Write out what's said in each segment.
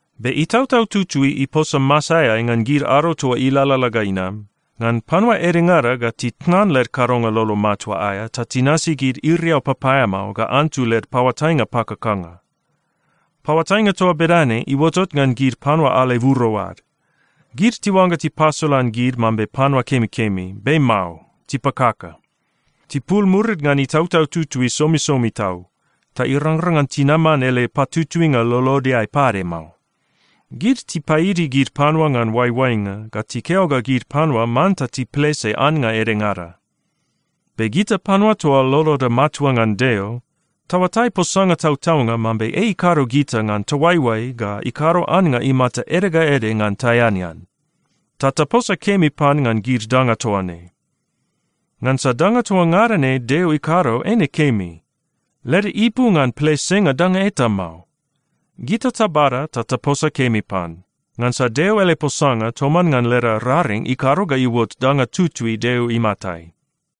Be Itautau Tutui iposa masaeai ngan gid ado toa ilalala ga inam, ngan panua edengada ga titnan led kadonga lolo matua aea ta tinasi gid iriau papaeamao ga antu led paoatainga pakakanga. Paoatainga toa bedane iuotot ngan gid panua aleburo ad. Gid tiuangga tipasolan gid mambe panua kemikemi, be mao, tipakaka. Tipul murid ngan Itautau Tutui somisomi tau, ta irangrang ngan tinaman ele patutuinga lolodeai pade mao. Gid tipaidi gid panua ngan oaioainga ga tikeo ga gid panua manta tiplese annga edengada. Be gita panua toa loloda matua ngan Deo, taoatai posanga tautaunga mambe ei ikado gita ngan taoaioai ga ikado annga imata ede ga ede ngan taeanean, ta taposa kemi pan ngan gid danga toa ne. Ngansa danga toa ngada ne Deo ikado eine kemi. Leda ipu ngan plesenga danga eta mao. Gita tabada ta taposa kemi pan, ngansa Deo ele posanga toman ngan leda raring ikado ga iuot danga tutui Deo imatai.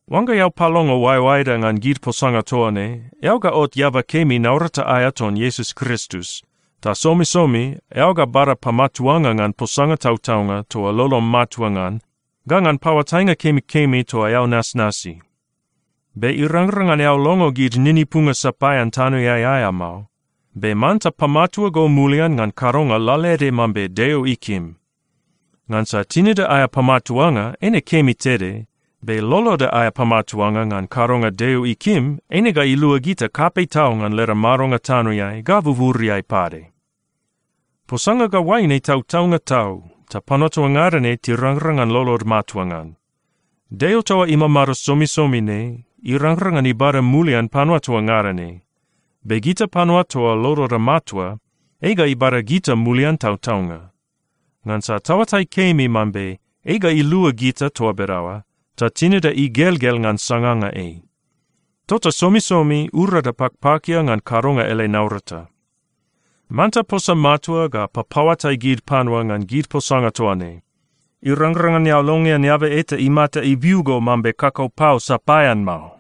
Oangga eao palongo oaeoaeda ngan gid posanga toa ne, eao ga ot eaba kemi naurata aea ton Iesus Kristus, ta somisomi eao ga bada pamatuanga ngan posanga tautaunga toa lolom matua ngan ga ngan paoatainga kemikemi toa eao nasnasi. Be irangrang ngan eao longo gid ninipunga sapaean tanoeai aea mao, be manta pamatua go mulian ngan kadonga lalaede mambe Deo ikim. Ngansa tinida aea pamatuanga eine kemi tede, be loloda aea pamatuanga ngan kadonga Deo ikim, eine ga ilua gita kapei tau ngan leda madonga tanoeai ga buburiai pade. Posanga ga oaine tautaunga tau, ta panua toa ngada ne tirangrang ngan lolod matua ngan. Deo toa imamado somisomi ne irangrang ngan ibada mulian panua toa ngada ne, be gita panua toa loloda matua, ei ga ibada gita mulian tautaunga. Ngansa taoatai kemi mambe ei ga ilua gita toa bedaoa, ta tinida igelgel ngan sanganga ei. Tota somisomi urada pakpakia ngan kadonga ele naurata. Manta posa matua ga papaoatai gid panua ngan gid posanga toa ne. Irangrang ngan eao longean eaba eta imata ibiu go mambe kakau pau sapaean mao.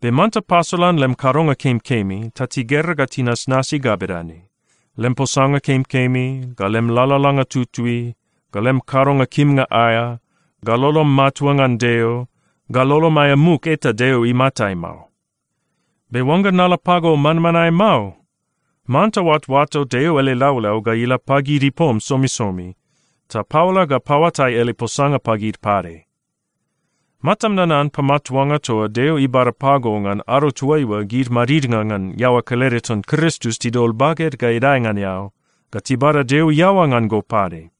Be manta pasolan lem kadonga kemikemi ta tigera ga tinasnasi ga bedane: lem posanga kemikemi, ga lem lalalanga tutui, ga lem kadonga kimnga aea, ga lolom matua ngan Deo, ga lolom aea muk eta Deo imatai mao. Be oangga nala pago manmanae mao, manta oatoato Deo ele laulau ga ila pagid ipom somisomi, ta paola ga paoatai ele posanga pagid pade. Matam nanan pamatuanga toa Deo ibada pago ngan ado toaiua gid madidnga ngan iaoa kelede ton Kristus tidol baged ga idae ngan eao ga tibada Deo iaoa ngan go pade.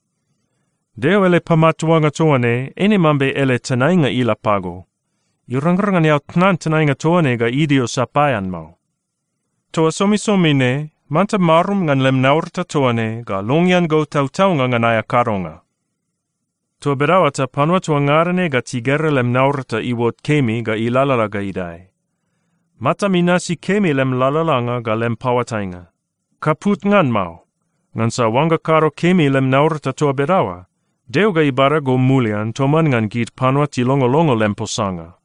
Deo ele pamatuanga toa ne, eine mambe ele tenainga ila pago. Irangrang ngan eao tnan tenainga toa ne ga idio sapaean mao. Toa somisomi ne manta marum ngan lem naurata toa ne ga longean go tautaunga ngan aea kadonga. Toa bedaoa ta panua toa ngada na ga tigera lem naurata iuot kemi ga ilalala ga idae. Matam inasi kemi lem lalalanga ga lem paoatainga. Kaput ngan mao, ngansa oangga kado kemi lem naurata toa bedaoa, Deo ga ibada go mulian toman ngan gid panua tilongolongo lem posanga.